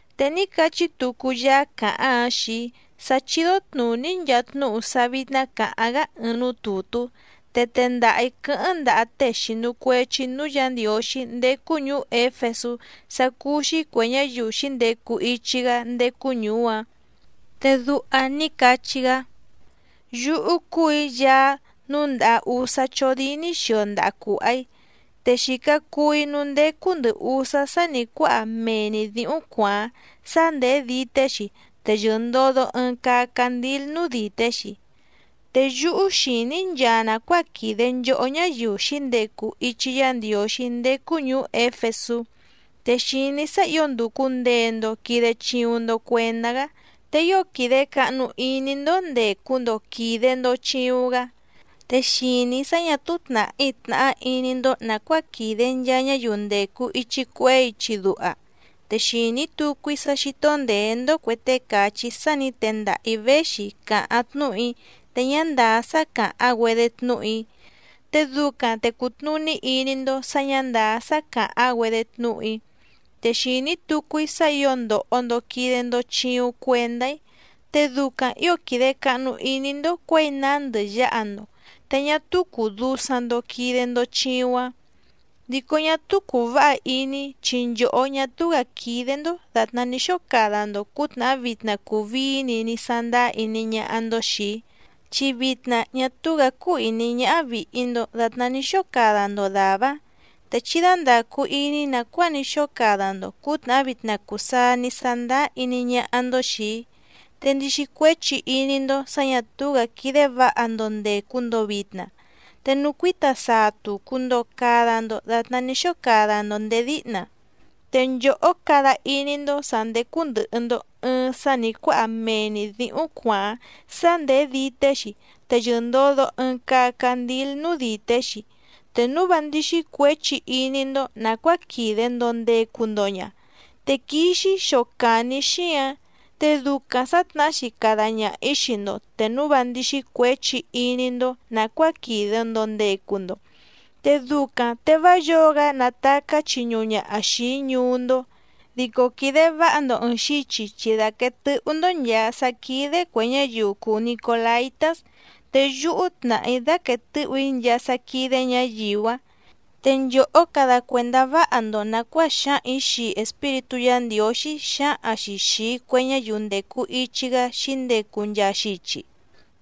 Te ní cachí tucu Yaá càháⁿ‑áⁿ xii‑í sá chídó tnùní‑í nchaa tnúhu sá vítná cǎháⁿ‑gá ɨɨⁿ núú tùtú, te tendaha‑ǐ quɨ́hɨ́ⁿ ndaha tée xìnu cuechi núú Yǎ Ndiǒxí ndécú ñùú Éfesú sá cúú‑xí cuè ñáyiu xǐndecu ichi‑gá ndécú ñùú‑áⁿ, te duha ní cachí‑gá: “Yúhú cúù‑í Yaá núndàha úsá chódíní xio ndaha cùha‑í, te xìca cuu‑í núú ndécú ndɨ̀ usá sá nǐ cuáha mee‑ni dǐhúⁿ cuàáⁿ, sá ndèé dité‑xi te yɨ̀ndodo ɨɨⁿ caa candíl núú dìté‑xi. Te yúhú xìní‑í nchaa nàcuáa quìde nchohó ñáyiu xǐndecu ichi Yá Ndiǒxí ndécú ñùú Éfesú, te xìní‑í sá ǐo ndùcu ndee‑ndo quide chiuⁿ‑ndo cuendá‑gá, te ío quìde cahnu iní‑ndó ndècu‑ndo quide‑ndo chiuⁿ‑gá. Te xìní‑í sá ñà túú tnàhí tnàhá iní‑ndó nàcuáa quìde nchaa ñáyiu ndècu ichi cuehé ichi duha. Te xìní tucu‑í sá xító ndèé‑ndó cuè tée càchí sá nǐ tendaha‑ǐ véxi càháⁿ tnúhu‑í te ñá ndàá sá càháⁿ‑güedé tnúhu‑í, te ducaⁿ te cùtnuní iní‑ndó sǎ ñǎ ndàá sá càháⁿ‑güedé tnúhu‑í. Te xìní tucu‑í sá ǐo ndòho‑ndo quide‑ndo chiuⁿ cuendá‑í, te ducaⁿ ǐo quìde cahnu iní‑ndó cuěi nándɨ yǎha‑ndo, te ñá túú cùu dusaⁿ‑ndo quide‑ndo chiuⁿ‑áⁿ. Dico ñá túú cùu váha iní‑í chi nchòhó ñá túú‑gǎ quídé‑ndó dàtná ní xóo cada‑ndo cǔtnàhá vitna cùu vií‑ni ní sándáá iní ñáhá‑ndó xìi‑í, chi vitna ñá túú‑gǎ cúú ìní ñáhá vìhi‑ndo datná ní xóo cada‑ndo dàvá‑áⁿ. Te chí dándàcu iní nàcuáa ní xóo cada‑ndo cǔtnàhá vitna cùu saa ní sándáá iní ñáhá‑ndó xìi‑í, te ndixi cuéchi iní‑ndó sǎ ñà túú‑gǎ quídé vǎha‑ndo ndècu‑ndo vitna, te nucuíta saa tùcu‑ndo cada‑ndo datná ní xóo cada‑ndo nděé díhna. Te nchòhó cada iní‑ndó sǎ ndécú ndɨ̀hɨ‑ndo ɨɨⁿ sá nǐ cuáha mee‑ni dǐhúⁿ cuàáⁿ, sá ndèé dité‑xi te yɨ̀ndodo ɨɨⁿ caa candíl núú dìté‑xi. Te núu vá ndíxí cuěchi iní‑ndó nàcuáa quìde‑ndo ndecu‑ndo ña, te quixi‑í xocàni‑í xíǎⁿ, te ducaⁿ sǎtnahá‑xi cada ñaha‑ǐ xii‑ndo te núu vá ndíxí cuěchi iní‑ndó nàcuáa quìde‑ndo ndecu‑ndo, te ducaⁿ te vá yǒo‑gá nàtacá chiñuhu ñaha xìi‑í ñuú‑ndó. Dico quìde váha‑ndo ɨ̀ɨⁿ xichi chi dàquee tɨhú‑ndó nchàa sá quídé cuè ñáyiu cùu nicolaitás, te yúhú tnàhá‑í dáquèe tɨ́hù‑í nchaa sá quídé ñǎyiu‑áⁿ. Te nchòhó cada cuèndá váha‑ndo nàcuáa xǎhaⁿ‑ǐ xii Espíritú Yǎ Ndiǒxí xǎhaⁿ‑xi xìi cue ñáyiu ndècu ichi‑gá xǐndecu nchaa xichi.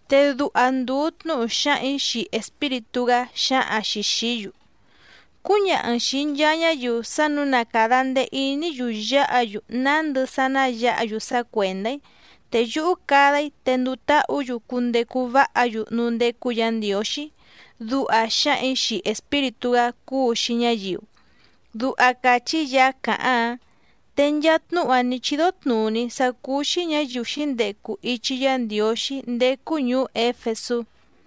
Te duha ndùu tnúhu xǎhaⁿ‑ǐ xii Espíritú‑gá xǎhaⁿ‑xi xìí‑yu: Cúñaha‑n xìi nchaa ñáyiu sá nǔu na càda ndee iní‑yu yáha‑yu nándɨ sá ná yǎha‑yu sá cuèndá‑í, te yúhú cada‑í te nduu táhǔ‑yu cundecu váha‑yu núú ndécú Yǎ Ndiǒxí, duha xǎhaⁿ‑ǐ xii Espíritú‑gá cúu‑xi ñáyiu”, duha càchí Yaá càháⁿ‑áⁿ. Te nchaa tnúhu‑áⁿ nǐ chídó tnùní‑í sá cúú‑xí ñǎyiu xǐndecu ichi Yá Ndiǒxí ndécú ñùú Éfesú.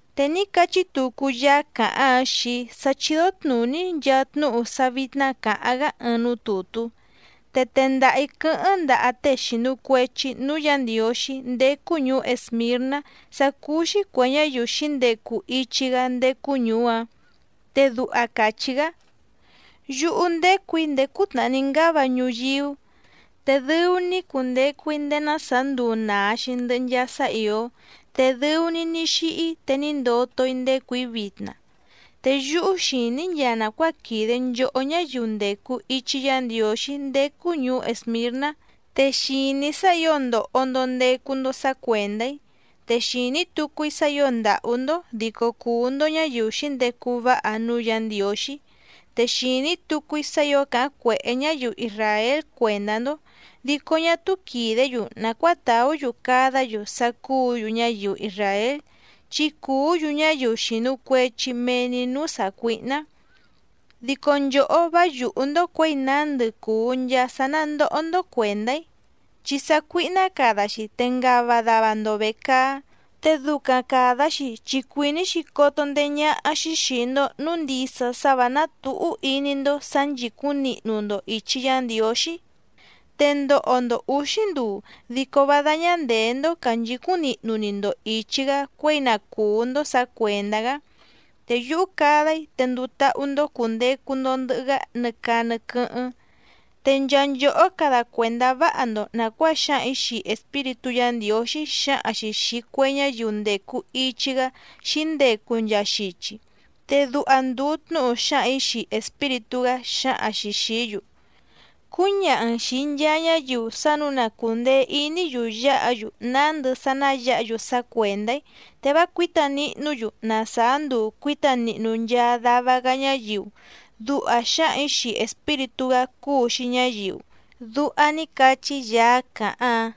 Te ní cachí tucu Yaá càháⁿ‑áⁿ xii‑í sá chídó tnùní‑í nchaa tnúhu sá vítná cǎháⁿ‑gá ɨɨⁿ núú tùtú, te tendaha‑ǐ quɨ́hɨ́ⁿ ndaha tée xìnu cuechi núú Yǎ Ndiǒxí ndécú ñùú Èsmirná sá cúú‑xí cuè ñáyiu xǐndecu ichi‑gá ndécú ñùú‑áⁿ, te duha càchí‑gá: “Yúhú ndécù‑í ndéé cútnàhá ní ngáva ñuyíú, te dɨu‑ni‑í cundecu‑í ndéé ná sàá nduu nàa‑xi ndɨhɨ nchaa sá ìó, te dɨu‑ni‑í ní xíhí te ní ndoto‑í ndécù‑í vitna. Te yúhú xìní‑í nchaa nàcuáa quìde nchohó ñáyiu ndècu ichi Yá Ndiǒxí ndécú ñùú Èsmirná. Te xìní‑í sá ǐo ndòho‑ndo ndecu‑ndo sá cuèndá‑í, te xìní tucu‑í sá ǐo ndàhú‑ndó dico cùu‑ndo ñáyiu xǐndecu váha núú Yǎ Ndiǒxí. Te xìní tucu‑í sá ǐo càháⁿ cuèhé ñáyiu isràél cuèndá‑ndó, dico ñá túú quìdé‑yu nàcuáa tàú‑yu cadá‑yu sá cúǔ‑yu ñáyiu isràél, chi cùú‑yu ñáyiu xìnu cuechi mee‑ni núú sàcuíhná. Dico nchòhó vá yùhú‑ndó cuěi nándɨ cùu nchaa sá ná ndòho‑ndo cuendá‑í, chi sácuíhná cada‑xi te ngava dava‑ndo vècaá, te ducaⁿ càda‑xi chi cuìní‑xi coto ndeé ñáhá‑xí xìi‑ndo núu ndisa sá vǎ ná tǔhú iní‑ndó sǎ nchìcúⁿ nihnu‑ndo ìchi Yá Ndiǒxí. Te ndoho‑ndo ǔxí nduu dico vá dáñá ndèé‑ndó cànchicúⁿ nihnu‑ni‑ndo ìchi‑gá cuěi na cùú‑ndó sǎ cuèndá‑gá, te yúhú cada‑í te nduu táhú‑ndó cùndecu‑ndo ndɨhɨ‑gá nɨ caa nɨ quɨ́hɨ́ⁿ. Te nchaa nchòhó cada cuèndá váha‑ndo nàcuáa xǎhaⁿ‑ǐ xii Espíritú Yǎ Ndiǒxí xǎhaⁿ‑xi xìi cue ñáyiu ndècu ichi‑gá xǐndecu nchaa xichi, te duha ndùu tnúhu xǎhaⁿ‑ǐ xii Espíritú‑gá xǎhaⁿ‑xi xìí‑yu: Cúñaha‑n xìi nchaa ñáyiu sá nǔu na cùndee iní‑yu yáha‑yu nándɨ sá ná yǎha‑yu sá cuèndá‑í te vá cuǐta nihnú‑yu na sàá nduu cuǐta nihnu nchaa dava‑gá ñáyiu, duha xǎhaⁿ‑ǐ xii Espíritú‑gá cúu‑xi ñáyiu”, duha ní cachí Yaá càháⁿ‑áⁿ.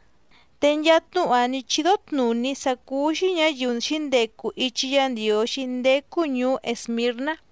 Te nchaa tnúhu‑áⁿ nǐ chídó tnùní‑í sá cúú‑xí ñǎyiu xǐndecu ichi Yá Ndiǒxí ndécú ñùú Èsmirná.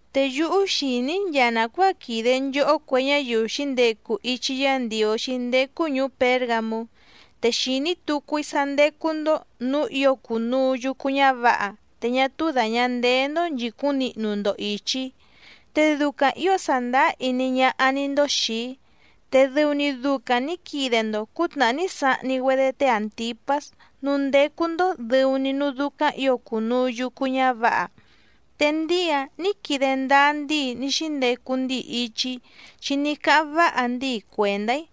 Te yúhú xìní‑í nchaa nàcuáa quìde nchohó cue ñáyiu xǐndecu ichi Yá Ndiǒxí ndécú ñùú Pěrgamú, te xìní tucu‑í sá ndécú‑ndó nǔú ǐo cùnuu yucu ñávǎha, te ñá túú dàña ndeé‑ndó nchìcúⁿ nihnu‑ndo ìchi‑í, te ducaⁿ ǐo sàndáá iní ñáhá‑ní‑ndó xìi‑í, te dɨu‑ni ducaⁿ nǐ quide‑ndo cǔtnàhá ní sahni‑güedé té Àntipás núú ndécú‑ndó dɨ̀u‑ni núú dúcáⁿ ǐo cùnuu yucu ñávǎha. Te ndíi‑áⁿ nǐ quide ndáá ndíi ní xíndecu ndíi ichi‑í chi ní cáháⁿ váha ndíi cuèndá‑í.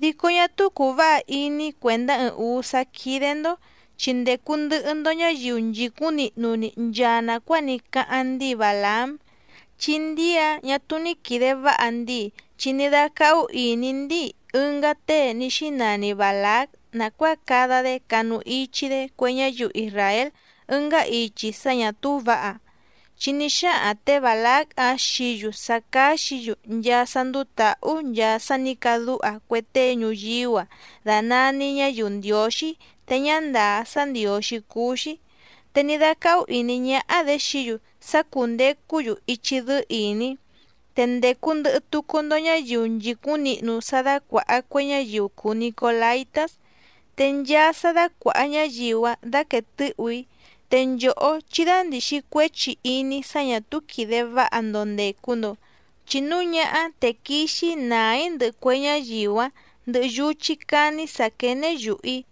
Dico ñá túú cùu váha iní‑í cuèndá ɨɨⁿ ǔú sá quídé‑ndó, chi ndècu ndɨhɨ‑ndo ñáyiu nchìcúⁿ nihnu‑ni nchaa nàcuáa ní cáháⁿ ndíi Bàlaám. Chi ndíi‑áⁿ ñà túú ní quìde váha ndíi chi ní dácáhú ìní ndíi ɨngá tée ní xínani Bàlác nàcuáa cada‑dé canu ichi‑dé cue ñáyiu isràél ɨngá ichi sá ñà túú vǎha, chi ní xáhaⁿ tě Bàlác‑áⁿ xií‑yu sá cáxǐ‑yu nchaa sá ndúú tǎhú nchaa sá nǐ cadúha cue tée ñuyíú‑a dànani ñáyiu ndiǒxí te ñá ndàá sá ndiǒxí cúú‑xí, te ní dácáhú ìní ñáhá‑dě xií‑yu sá cúndècú‑yu ichi dɨ́ɨ́ ìní. Te ndècu ndɨhɨ tucu‑ndo ñáyiu nchìcúⁿ nihnu sá dácuàha cue ñáyiu cùu nicolaitás. Te nchaa sá dácuàha ñáyiu‑áⁿ dáquèe tɨ́hù‑í, te nchòhó chí dándìxi cuéchi iní sá ñà túú quìde váha‑ndo ndècu‑ndo, chi núu ñáhá te quixi‑í nàá‑í ndɨhɨ cue ñáyiu‑áⁿ ndɨhɨ yuchí cání sǎ quéné yùhu‑í.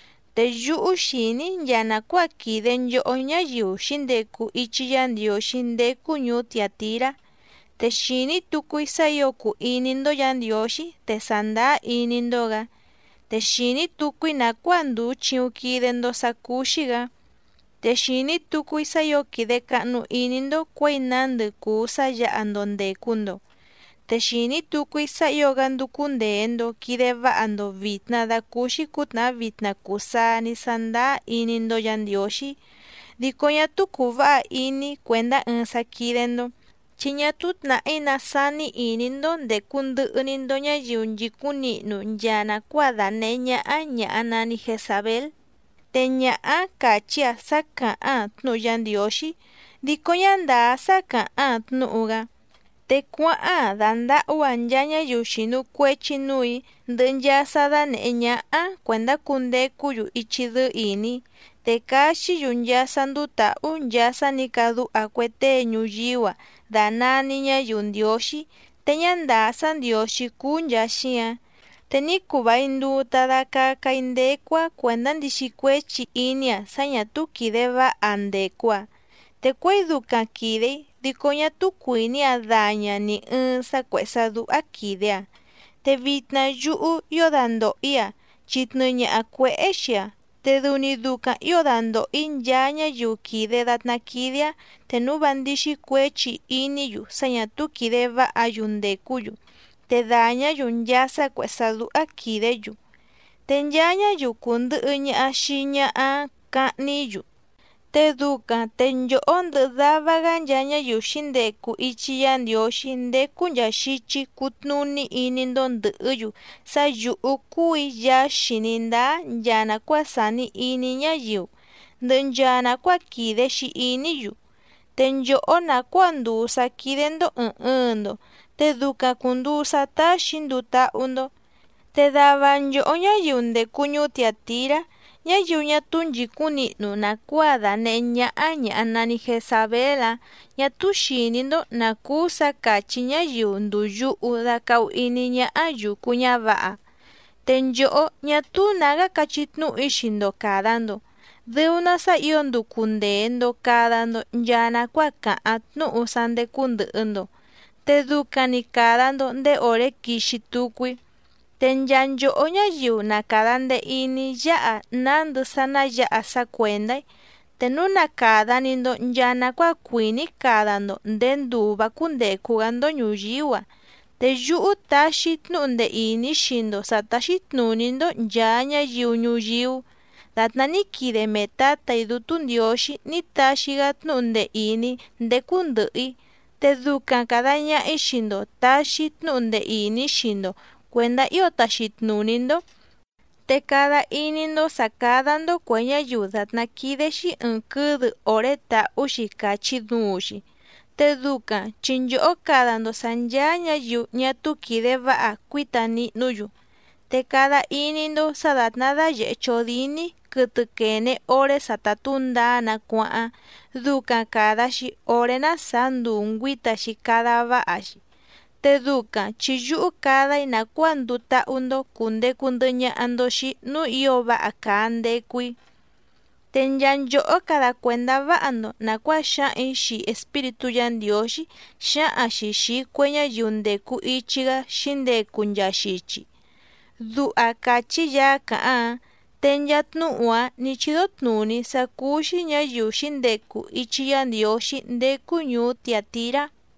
Te yúhú xìní‑í nchaa nàcuáa quìde nchohó ñáyiu xǐndecu ichi Yá Ndiǒxí ndécú ñùú Tiàtirá. Te xìní tucu‑í sá ǐo cùu iní‑ndó Yǎ Ndiǒxí te sàndáá iní‑ndó‑gǎ. Te xìní tucu‑í nàcuáa ndùu chiuⁿ quide‑ndo sá cúú‑xí‑gǎ. Te xìní tucu‑í sá ǐo quìde cahnu iní‑ndó cuěi nándɨ cùu sá yǎha‑ndo ndècu‑ndo. Te xìní tucu‑í sá ǐo‑gá ndúcú ndèe‑ndo quide váha‑ndo vìtna dacúúxí cǔtnàhá vitna cùu saa ní sándáá iní‑ndó Yǎ Ndiǒxí. Dico ñá túú cùu váha iní‑í cuèndá ɨɨⁿ sá quídé‑ndó, chi ñá túú tnàhí ná sání ìní‑ndó ndècu ndɨhɨ‑ni‑ndo ñáyiu nchìcúⁿ nihnu nchaa nàcuáa dànehé ñáhá ñàha nani Jezabél. Te ñaha‑áⁿ càchí‑aⁿ sá càháⁿ‑aⁿ tnúhu Yá Ndiǒxí dico ñá ndàá sá càháⁿ‑aⁿ tnúhu‑gá, te cuáháⁿ‑aⁿ dàndahú‑aⁿ nchaa ñáyiu xìnu cuechi núù‑í ndɨhɨ nchaa sá dánèhé ñáhá‑áⁿ cuèndá cundecú‑yu ichi dɨ́ɨ́ ìní, te caxí‑yu nchaa sá ndúú tǎhú nchaa sá nǐ cadúha cue tée ñuyíú‑a dànani ñáyiu ndiǒxí te ñá ndàá sá ndiǒxí cúú nchàa xíǎⁿ. Te ní cuu vài nduu ta dacaca‑í ndécú‑áⁿ cuèndá ndixi cuéchi iní‑aⁿ sá ñà túú quìde váha‑aⁿ ndècu‑aⁿ, te cuěi ducaⁿ quìde‑í dico ñá túú cuìní‑aⁿ daña‑aⁿ nì ɨɨⁿ sá cuèhé sá dúhá quìde‑aⁿ. Te vitna yúhú ío dandòho‑í‑aⁿ chi tnɨɨ ñaha cuěhé xii‑aⁿ, te dɨu‑ni ducaⁿ ǐo dandòho‑í nchaa ñáyiu quìde datná quídé‑áⁿ te núu vá ndíxí cuěchi iní‑yu sá ñà túú quìde váha‑yu ndècú‑yu, te dàñá‑yu nchaa sá cuèhé sá dúhá quìdé‑yu. Te nchaa ñáyiu cùndɨhɨ ñaha xii ñaha‑áⁿ cahni‑í‑yu, te ducaⁿ te nchòhó ndɨhɨ dava‑gá nchaa ñáyiu xǐndecu ichi Yá Ndiǒxí ndécú nchàa xichi cutnuní iní‑ndó ndɨ̀hɨ́‑yu sá yǔhú cúù‑í Yaá xìní ndáá nchaa nàcuáa sàni iní ñáyiu, ndɨhɨ nchaa nàcuáa quìde‑xi iní‑yu. Te nchòhó nàcuáa ndùu sá quídé‑ndó ɨ̀ɨⁿ ɨɨⁿ‑ndo te ducaⁿ cùnduu sá táxì‑í nduu táhú‑ndó. Te dava nchòhó ñáyiu ndècu ñuú Tiàtirá, ñáyiu ñá túú nchìcúⁿ nihnu nàcuáa dànehé ñáhá ñàha nani Jezabél‑áⁿ ñà túú xìní‑ndó nǎ cúú sǎ càchí ñáyiu ndùu yuhu dacahu iní ñáhá yùcu ñávǎha. Te nchòhó, ñá túú nǎgá cachí tnúhu‑í xii‑ndo càda‑ndo dɨu‑ná sá ǐo nducu ndèe‑ndo cada‑ndo nchaa nacuáa càháⁿ tnúhu sá ndécú ndɨ̀hɨ‑ndo, te ducaⁿ‑ni càda‑ndo ndéé òré quixi tucu‑í. Te nchaa nchòhó ñáyiu na càda ndee iní yáha nándɨ sá ná yǎha sá cuèndá‑í, te núu na càda‑ni‑ndo nchaa nacuáa cuìní‑í cada‑ndo nděé nduu vǎ cúndècu‑gá‑ndó ñùyíú‑a, te yúhú taxi‑í tnúhu ndee ìní xii‑ndo sǎ táxí tnùní‑ndó nchàa ñáyiu ñuyíú dàtná ní quide mee Tǎtà‑í Dútú Ndiǒxí ní taxi‑gá tnúhu ndee ìní ndécú ndɨ̀hɨ‑í, te ducaⁿ càda ñaha‑í xii‑ndo tàxi‑í tnúhu ndee ìní xii‑ndo cuèndá ío taxi tnùní‑ndó, te cada iní‑ndó sǎ cádá‑ndó cuè ñáyiu dàtná quídé‑xí ɨ̀ɨⁿ quɨ́dɨ òré tàhú‑xi càchi duuⁿ‑xi, te ducaⁿ chi nchòhó cada‑ndo sǎ ncháá ñǎyiu ñá túú quìde váha cuíta nihnú‑yu. Te cada iní‑ndó sǎ dàtná dáyèhé chódíní quɨtɨ quène oré sa ta tǔndaá‑nǎ cuáháⁿ ducaⁿ càda‑xi oré ná sàá nduu ngüǐta‑xi cada váha‑xi, te ducaⁿ chi yúhú cada‑í nàcuáa nduu táhú‑ndó cùndecu ndɨhɨ ñaha‑ndo xii‑í núú ǐo váha càa ndecu‑í. Te nchaa nchòhó cada cuèndá váha‑ndo nàcuáa xǎhaⁿ‑ǐ xii Espíritú Yǎ Ndiǒxí xǎhaⁿ‑xi xìi cue ñáyiu ndècu ichi‑gá xǐndecu nchaa xichi”, duha càchí Yaá càháⁿ‑áⁿ. Te nchaa tnúhu‑áⁿ nǐ chídó tnùní‑í sá cúú‑xí ñǎyiu xǐndecu ichi Yá Ndiǒxí ndécú ñùú Tiàtirá.